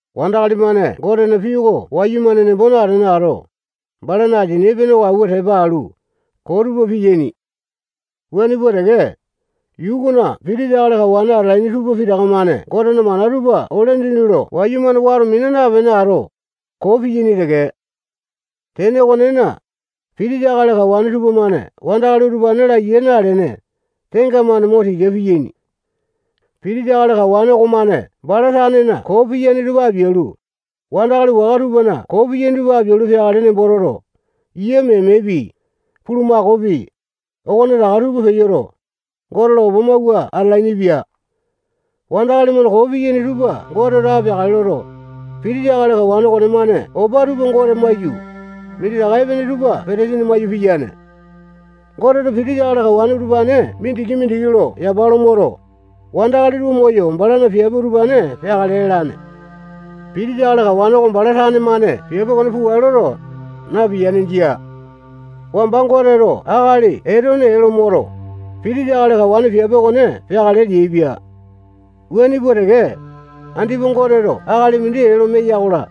Wandakali-mane Gotena pii oko wayumane nembo natene ato, balana asini epene oko awua tepa alu, koo tupa piyaini. Wuane pua teke, yuu okona pitisa akali kawane atalaini tupa pitaka-mane Gotena mana tupa ole dindi lo wayumane wato mina napene ato, koo piyaini teke. Tene okonena, pitisa akali kawane tupamane wandakali utupane laiya nalene, tenga-mane mo tika piyaini. Pitisa akali kawane okomane bala tanena koo piyane tupa apialu, wandakali waka tupana koo piyaini tupa apialu peakale nembo toto, yia memepi, bulumakaopi, okonetaka tupa peyoto, Gote lo opa mawua atalainipia. Wandakali-mane koo piyaini tupa Goteto apeakale loto, pitisa akali kawane okonemane opa tupa Gote maiyu, minditaka epene tupa petesini maiyu piyane. Goteto pitisa akali kawane utupane mindiki-mindiki lo yapa lo moto, wandakali tupa moyo balana piape utupane peakale lalane. Pitisa akali kawane oko bala tane-mane piape okone pukale loto, napiyane. Jia. Wamba Goteto akali Etone ee lo moto, pitisa akali kawane piape okone peakale leaipia. Wuane pua teke, andipa Goteto akali mindi ee lo meya-kola,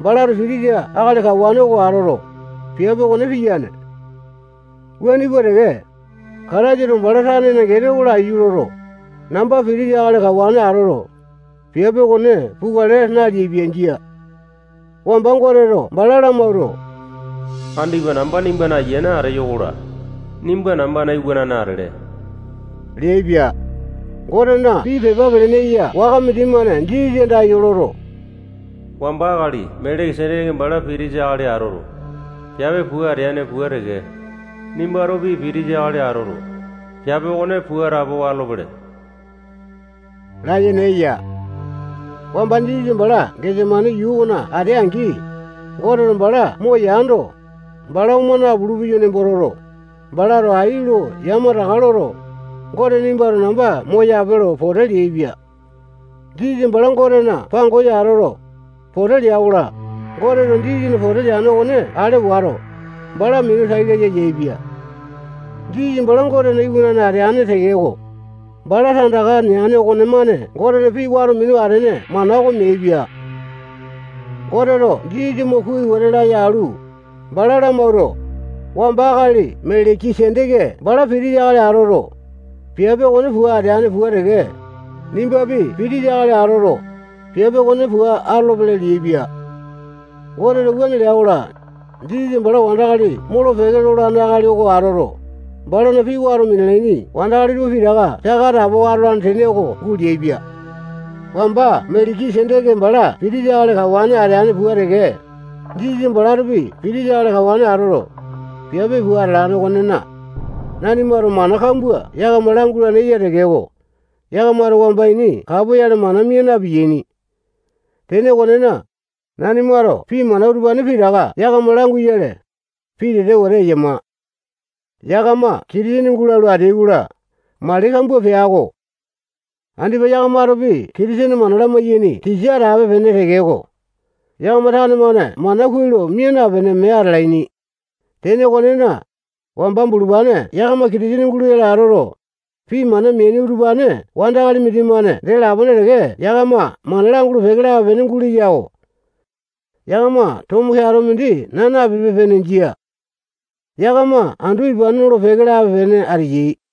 balato pitisa akali kawane oko atoto, piape okone piyane. Wuane pua teke, Kataisato bala tanena gene oko laiyu loto, namba pitisa akali kawane atoto, piape okone pukale naleaipia. Jia. Wamba Goteto bala lamawuato, andipa namba nimbana ayiane ateyo-kola, nimba nambana iwanane atele leaipia. Gotena pii pepa pelene eya waka mindimane Jisasa andayo loto, wamba akali Meleki-seteke bala pitisa akali atoto, piape pua ateane pua teke, nimbatopi pitisa akali atoto, piape okone pua atapowa atolopele layene eya. Wamba Jisasa bala Gesemani yuu okona atea-angi, Goteto bala moyando, bala oma napulu-peya nembo toto, balato ai lo yamataka loto, Gote nimbato namba moyape lo pote leaipia. Jisasa bala Gotena pangosa atoto, pote lea-kola, Goteto Jisasana pote leane okone ale wato, bala minu tai laya yaepia. Jisasa bala Gotena iwanane ateane tekeko, bala tandaka neane okonemane Gotena pii wato minu atene mana oko meaipia. Goteto Jisasa mo kuai wete laya alu, bala lamawuato, wamba akali Meleki-seteke bala pitisa akali atoto, piape okone pua ateane pua teke, nimbapi pitisa akali atoto, piape okone pua atolopele leaipia. Goteto wuane lea-kola, Jisasa bala wandakali molo-peke lolane akali oko atoto, balana pii wato minalaini wandakali tupa pitaka saka atapowa atolane tene oko guleaipia. Wamba Meleki-seteke bala pitisa akali kawane ateane wuane pua teke, Jisasa balatopi pitisa akali kawane atoto, piape pua atalane okonena, nanimato mana kambua yakama langulane eya tekeko, yakamato wamba ini kapoyale mana mia na-piyaini. Tene okonena, nanimato pii mana utupane pitaka yakama languyale, pitete wete eyama. Yakama Kitisene gulalu ateai-kola, mali kambua pea-ko. Andipa yakamatopi Kitisene mana lamaiyane tisa atape-pene tekeko, yakama tane-mane mana kuai lo mia napene mee atalaini. Tene okonena, wamba bulupane yakama Kitisene guloyale atoto, pii mana meaini utupane wandakali mindimane dee lapone teke yakama mana langulu-peke lape-pene guleya-ko. Yakama tomo keato mindi nanape-pene. Jia. Yakama andu ipane nolo-peke lape-pene ateyai.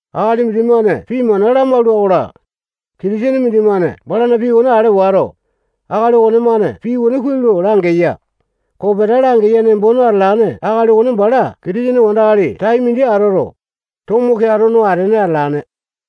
Akali mindimane pii mana lamalua-kola, Kitisene mindimane balana pii okone ale wato, akali okonemane pii kuai lo langeya, kopeta langeya nembo talane akali okone bala Kitisene wandakali tai mindi atoto, tomo keato no atene atalane.